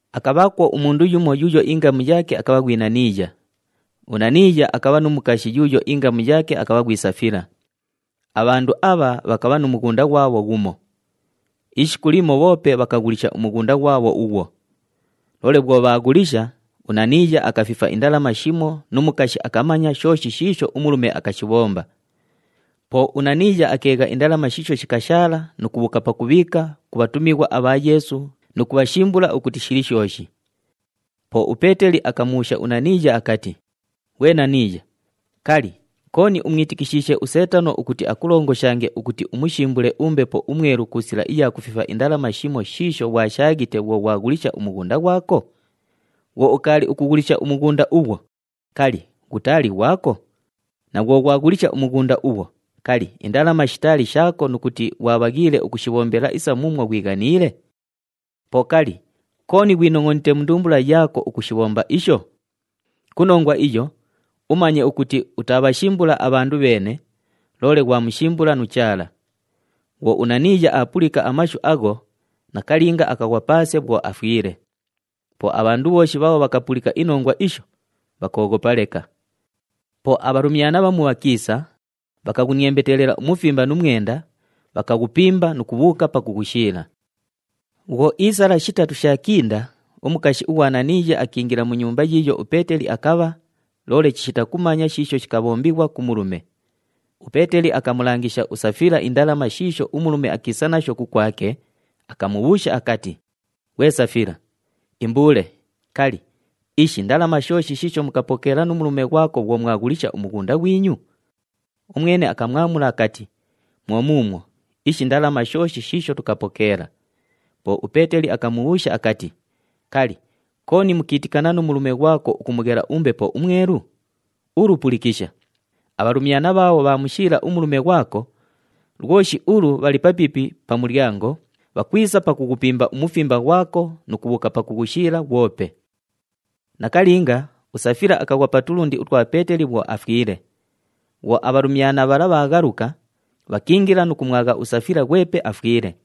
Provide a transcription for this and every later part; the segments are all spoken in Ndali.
Akabhaakwo umundu yumo yuuyo ingamu yaake akabha ghwi Naniiya. UNaniiya akabha nu mukashi yuuyo ingamu yaake akabha ghwi Safila. Abhandu abha bhakabha nu mughunda ghwabho ghumo. Ishiku limo bhoope bhakaghulisha umughunda ghwabho ughwo. Loole bhwo bhaaghulisha, uNaniiya akafifa indalama shimo nu mukashi akamanya shooshi shiisho umulume akashibhomba. Po uNaniiya akeegha indalama shiisho shikashaala nu kubhuuka pakubhiika ku bhatumighwa abha Yeesu nu kubhashimbula ukuti shili shooshi. Po uPeeteli akamubhuusha uNaniiya akati, “Ghwe Naniiya, kali, kooni umwitikishiishe uSeetano ukuti akulongoshange, ukuti umushimbule uMbepo uMwelu ku sila iya kufifa indalama, shimo shiisho ghwashaaghite bhwo ghwaghulisha umughunda ghwako? Bhwo ukaali ukughulisha umughunda ughwo, kali, ghutaali ghwako? Na bhwo ghwaghulisha umughunda ughwo, kali, indalama shitaali shaako nu kuti ghwabhaghiile ukushibhombela isa muumwo ghwighaniile? Po kali, kooni ghwinongʼonite mu ndumbula yaako ukushibhomba isho? Ku nongwa iyo, umanye ukuti utaabhashimbula abhandu bheene, loole ghwamushimbula nu Chaala.” Bhwo uNaniiya aapulika amashu agho, nakalinga akaghwa paase bhwo afwile. Po abhandu bhooshi bhaabho bhakapulika inongwa isho, bhakooghopa leka. Po abhalumyana bhamu bhakiisa, bhakaghuniembetelela umufimba nu mwenda, bhakaghupimba nu kubhuuka pakughushiila. Bhwo iisala shitatu shaakinda, umukashi ughwa Naniiya akiingila mu nyumba yiiyo uPeeteli akabha, loole chishita kumanya shiisho shikabhombighwa ku mulume. UPeeteli akamulangisha uSafila indalama shiisho umulume akiisa nasho kukwake, akamubhuusha akati, “Ghwe Safila, imbuule, kali, ishi ndalama shooshi shiisho mukapokeela nu mulume ghwako bhwo mwaghulisha umughunda ghwinyu?” Umwene akamwamula akati, “Mwo muumwo, ishi ndalama shooshi shiisho tukapokeela.” Po uPeeteli akamubhuusha akati, “Kali, kooni mukiitikana nu mulume ghwako ukumughela uMbepo uMwelu? Ulu pulikisha! Abhalumyana bhaabho bhaamushiila umulume ghwako, lwoshi ulu bhali papiipi pa mulyango, bhakwisa pakughupimba umufimba ghwako nu kubhuuka pakughushiila ghwope.” Nakalinga, uSafila akaghwa pa tulundi utwa Peeteli bhwo afwile. Bhwo abhalumyana bhala bhaaghaluka, bhakiingila nu kumwagha uSafila ghwepe afwile.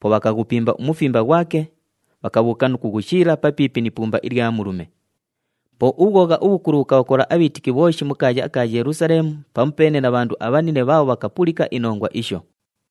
Po bhakaghupimba umufimba ghwake, bhakabhuuka nu kughushiila papiipi ni ipumba ilya mulume. Po ubhwogha ubhukulu bhukabhakola abhiitiki bhooshi mu kaaya aka Yelusaleemu pamupeene na bhandu abhanine bhaabho bhakapulika inongwa isho.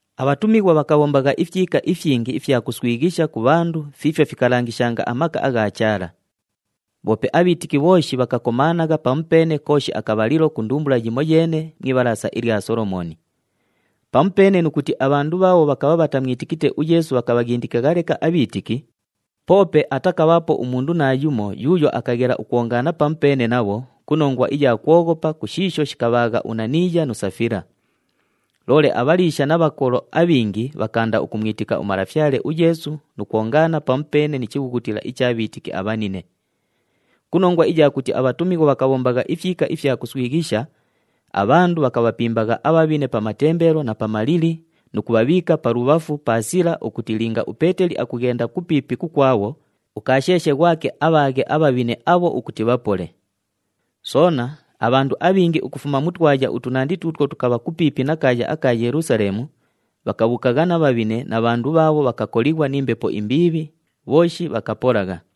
Abhatumighwa bhakabhombagha ifyika ifyingi ifya kuswighisha ku bhandu fiifyo fikalangishanga amaka agha Chaala. Bhoope abhiitiki bhooshi bhakakomaanagha pamupeene kooshi akabhalilo ku ndumbula yimoyeene mu Ibhalaasa ilya Solomooni. Pamupeene nu kuti abhandu bhaabho bhakabha bhatamwitikite uYeesu bhakabhaghindikagha leka abhiitiki, poope atakabhaapo umundu naayumo yuuyo akaghela ukwongaana pamupeene nabho, ku nongwa iya kwoghopa ku shiisho shikabhaagha uNaniiya nu Safila. Loole abhaliisha na bhakolo abhingi bhakaanda ukumwitika uMalafyale uYeesu nu kwongaana pamupeene ni chibhughutila icha bhiitiki abhanine. Ku nongwa iya kuti abhatumighwa bhakabhombagha ifyika ifya kuswighisha, abhandu bhakabhapimbagha abhabhine pa matembelo na pa malili nu kubhabhiika palubhafu pa sila ukuti linga uPeeteli akughenda kupiipi kukwabho, ukaasheeshe ghwake abhaaghe abhabhine abho ukuti bhapole. Soona, abhandu abhingi ukufuma mu twaya utunandi tuutwo tukabha kupiipi na kaaya aka Yelusaleemu bhakabhuukagha na bhabhine na bhandu bhaabho bhakakolighwa ni mbepo imbiibhi, bhooshi bhakapolagha.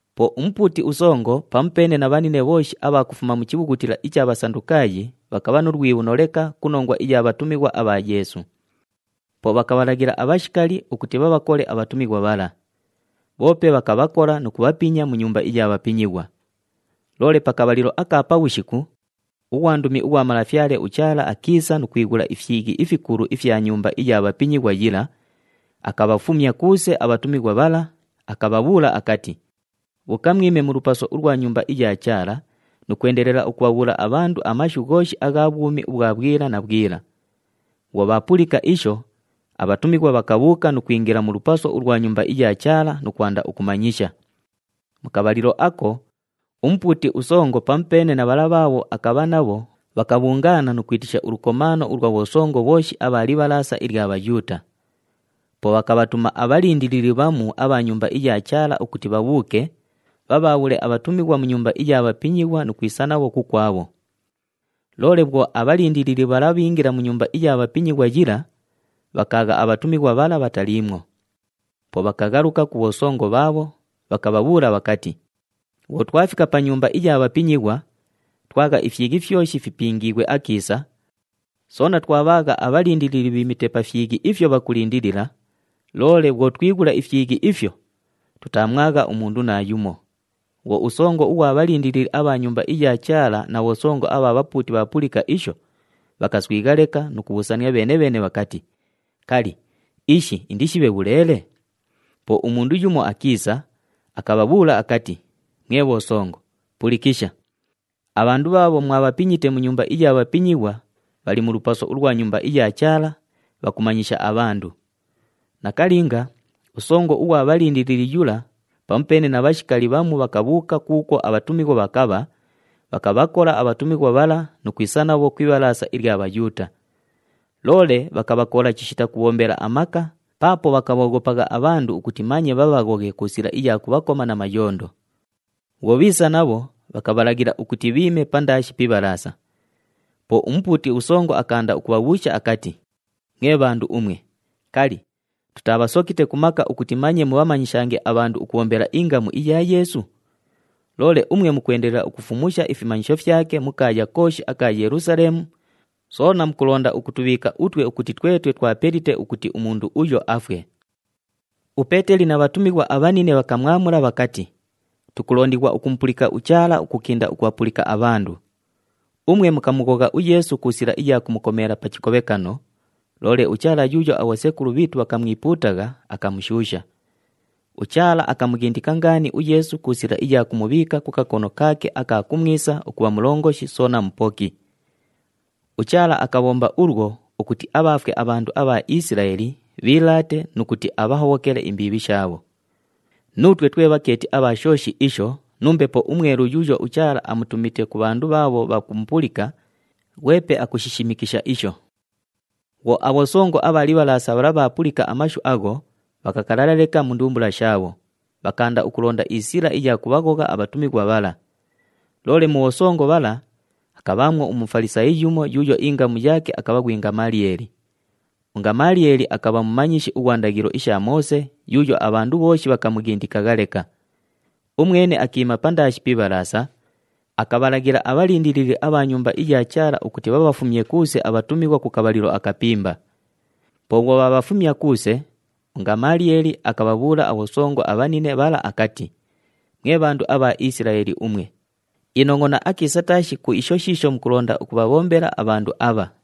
Po umupuuti usongo, pamupeene na bhanine bhooshi abha kufuma mu chibhughutila icha Bhasandukaayi, bhakabha nu lwibhuno leka ku nongwa iya bhatumighwa abha Yeesu. Po bhakabhalaghila abhashikali ukuti bhabhakole abhatumighwa bhala. Bhoope bhakabhakola nu kubhapinya mu nyumba iya bhapinyighwa. Loole pa kabhalilo aka pabhushiku, ughwandumi ughwa Malafyale uChaala akiisa nu kwighula ifyighi ifikulu ifya nyumba iya bhapinyighwa yila, akabhafumya kuuse abhatumighwa bhala, akabhabhuula akati, “Bhuuka mwime mu lupaso ulwa Nyumba iya Chaala nu kwendelela ukubhabhuula abhandu amashu ghooshi agha bhwumi ubhwa bhwila na bhwila.” Bhwo bhaapulika isho, abhatumighwa bhakabhuuka nu kwingila mu lupaso ulwa Nyumba iya Chaala nu kwanda ukumanyisha. Mu kabhalilo ako, umupuuti usongo, pamupeene na bhala bhaabho akabha nabho, bhakabhungaana nu kwitisha ulukomaano ulwa bhosongo bhooshi abha Libhalaasa ilya Bhayuuta. Po bhakabhatuma abhalindilili bhamu abha Nyumba iya Chaala ukuti bhabhuuke, bhabhaabhule abhatumighwa mu nyumba iya bhapinyighwa nu kwisa nabho kukwabho. Loole bhwo abhalindilili bhala bhiingila mu nyumba iya bhapinyighwa yila, bhakaagha abhatumighwa bhala bhataliimwo. Po bhakaghaluka ku bhosongo bhaabho, bhakabhabhuula bhakati, “Bhwo twafika pa nyumba iya bhapinyighwa, twagha ifyighi fyoshi fipingiighwe akiisa, soona twabhaagha abhalindilili bhiimite pa fyighi ifyo bhakulindilila, loole bhwo twighula ifyighi ifyo, tutaamwagha umundu naayumo.” Bhwo usongo ughwa bhalindilili abha Nyumba iya Chaala na bhosongo abha bhapuuti bhaapulika isho, bhakaswigha leka nu kubhuusania bheene-bheene bhakati, “Kali, ishi indishibhe bhuleele?” Po umundu yumo akiisa, akabhabhuula akati, “Mwe bhosongo, pulikisha! Abhandu bhaabho mwabhapinyite mu nyumba iya bhapinyighwa bhali mu lupaso ulwa Nyumba iya Chaala, bhakumanyisha abhandu!” Nakalinga, usongo ughwa bhalindilili yula, pamupeene na bhashikali bhamu, bhakabhuuka kuukwo abhatumighwa bhakabha, bhakabhakola abhatumighwa bhala nu kwisa nabho ku Ibhalaasa ilya Bhayuuta. Loole bhakabhakola chishita kubhombela amaka, paapo bhakabhooghopagha abhandu ukuti manye bhabhaghoghe ku sila iya kubhakoma na mayondo. Bhwo bhiisa nabho, bhakabhalaghila ukuti bhiime pandaashi pi Ibhalaasa. Po umupuuti usongo akaanda ukubhabhuusha akati, “Mwe bhandu umwe, kali, tutaabhasokite ku maka ukuti manye mubhamanyishange abhandu ukubhombela ingamu iya Yeesu? Loole umwe mukwendelela ukufumusha ifimanyisho fyake mu kaaya kooshi aka Yelusaleemu, soona mukulonda ukutubhiika utwe ukuti twetwe twapelite ukuti umundu uyo afwe!” UPeeteli na bhatumighwa abhanine bhakamwamula bhakati, “Tukulondighwa ukumupulika uChaala ukukinda ukubhapulika abhandu. Umwe mukamughogha uYeesu ku sila iya kumukomeela pa chikobhekano, loole uChaala yuuyo abhosekulu bhiitu bhakamwipuutagha akamushuusha. UChaala akamughindika ngaani uYeesu ku sila iya kumubhiika ku kakono kaake aka kumwisa ukubha Mulongoshi soona Mupoki. UChaala akabhomba ulwo ukuti abhaafwe abhandu abha Isilaeli bhiilaate nu kuti abhahobhokele imbiibhi shaabho. Nuutwe twe bhakeeti abha shooshi isho nu Mbepo uMwelu yuuyo uChaala amutumite ku bhandu bhaabho bhakumupulika, ghwepe akushishimikisha isho.” Bhwo abhosongo abha Libhalaasa bhala bhaapulika amashu agho, bhakakalala leka mu ndumbula shaabho, bhakaanda ukulonda isila iya kubhaghogha abhatumighwa bhala. Loole mu bhosongo bhala, akabhaamwo uMufalisaayi yumo yuuyo ingamu yaake akabha ghwi Ngamaliyeeli. UNgamaliyeeli akabha mumanyishi ughwa ndaghilo isha Moose yuuyo abhandu bhooshi bhakamughindikagha leka. Umwene akiima pandaashi pi Ibhalaasa, akabhalaghila abhalindilili abha Nyumba iya Chaala ukuti bhabhafumye kuuse abhatumighwa ku kabhalilo akapimba. Po bhwo bhaabhafumya kuuse, uNgamaliyeeli akabhabhuula abhosongo abhanine bhala akati, “Mwe bhandu abha Isilaeli umwe, inongʼona akiisa taashi ku isho shiisho mukulonda ukubhabhombela abhandu abha.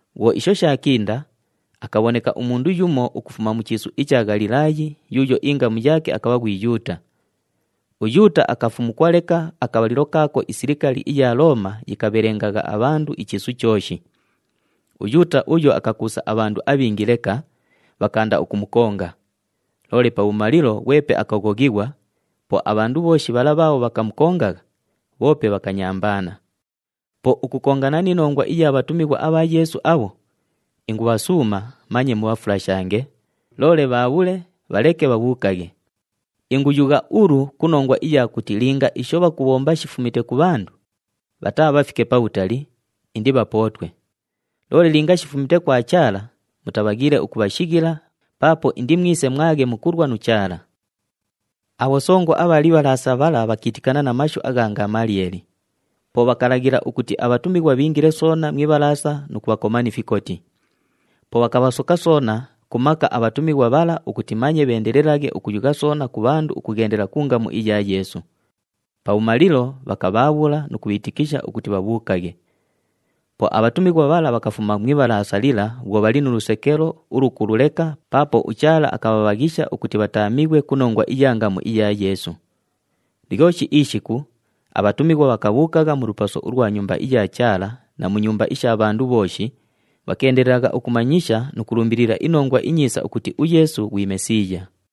Bhwo isho shaakinda, akabhoneka umundu yumo ukufuma mu chiisu icha Ghalilaayi yuuyo ingamu yaake akabha ghwi Yuuta. UYuuta akafumukwa leka akabhalilo kaako isilikali iya Looma yikabhelengagha abhandu ichiisu chooshi. UYuuta uyo akakuusa abhandu abhingi leka, bhakaanda ukumukonga. Loole pabhumalilo, ghwepe akaghoghighwa, po abhandu bhooshi bhala bhaabho bhakamukongagha, bhoope bhakanyambaana. Po ukukongana ni nongwa iya bhatumighwa abha Yeesu abho, ingubhasuuma, manye mubhafulashange, loole bhaabhule, bhaleke bhabhuukaghe. Inguyugha ulu ku nongwa iya kuti linga isho bhakubhomba shifumite ku bhandu, bhataabhafike pabhutali, indibhapootwe. Loole linga shifumite kwa Chaala, mutabhaghiile ukubhashighila paapo indimwise mwaghe mukulwa nu Chaala.” Abhosongo abha Libhalaasa bhala bhakiitikana na mashu agha Ngamaliyeeli. Po bhakalaghila ukuti abhatumighwa bhiingile soona mu Ibhalaasa nu kubhakoma ni fikoti. Po bhakabhasoka soona ku maka abhatumighwa bhala ukuti manye bheendelelaghe ukuyugha soona ku bhandu ukughendela ku ngamu iya Yeesu. Pabhumalilo, bhakabhaabhula nu kubhiitikisha ukuti bhabhuukaghe. Po abhatumighwa bhala bhakafuma mu Ibhalaasa lila bhwo bhali nu lusekelo ulukulu leka paapo uChaala akabhabhaghisha ukuti bhataamighwe ku nongwa iya ngamu iya Yeesu. Lyoshi ishiku, abhatumighwa bhakabhuukagha mu lupaso ulwa Nyumba iya Chaala na mu nyumba isha bhandu bhooshi, bhakeendelelagha ukumanyisha nu kulumbilila iNongwa iNyiisa ukuti uYeesu ghwi Mesiiya.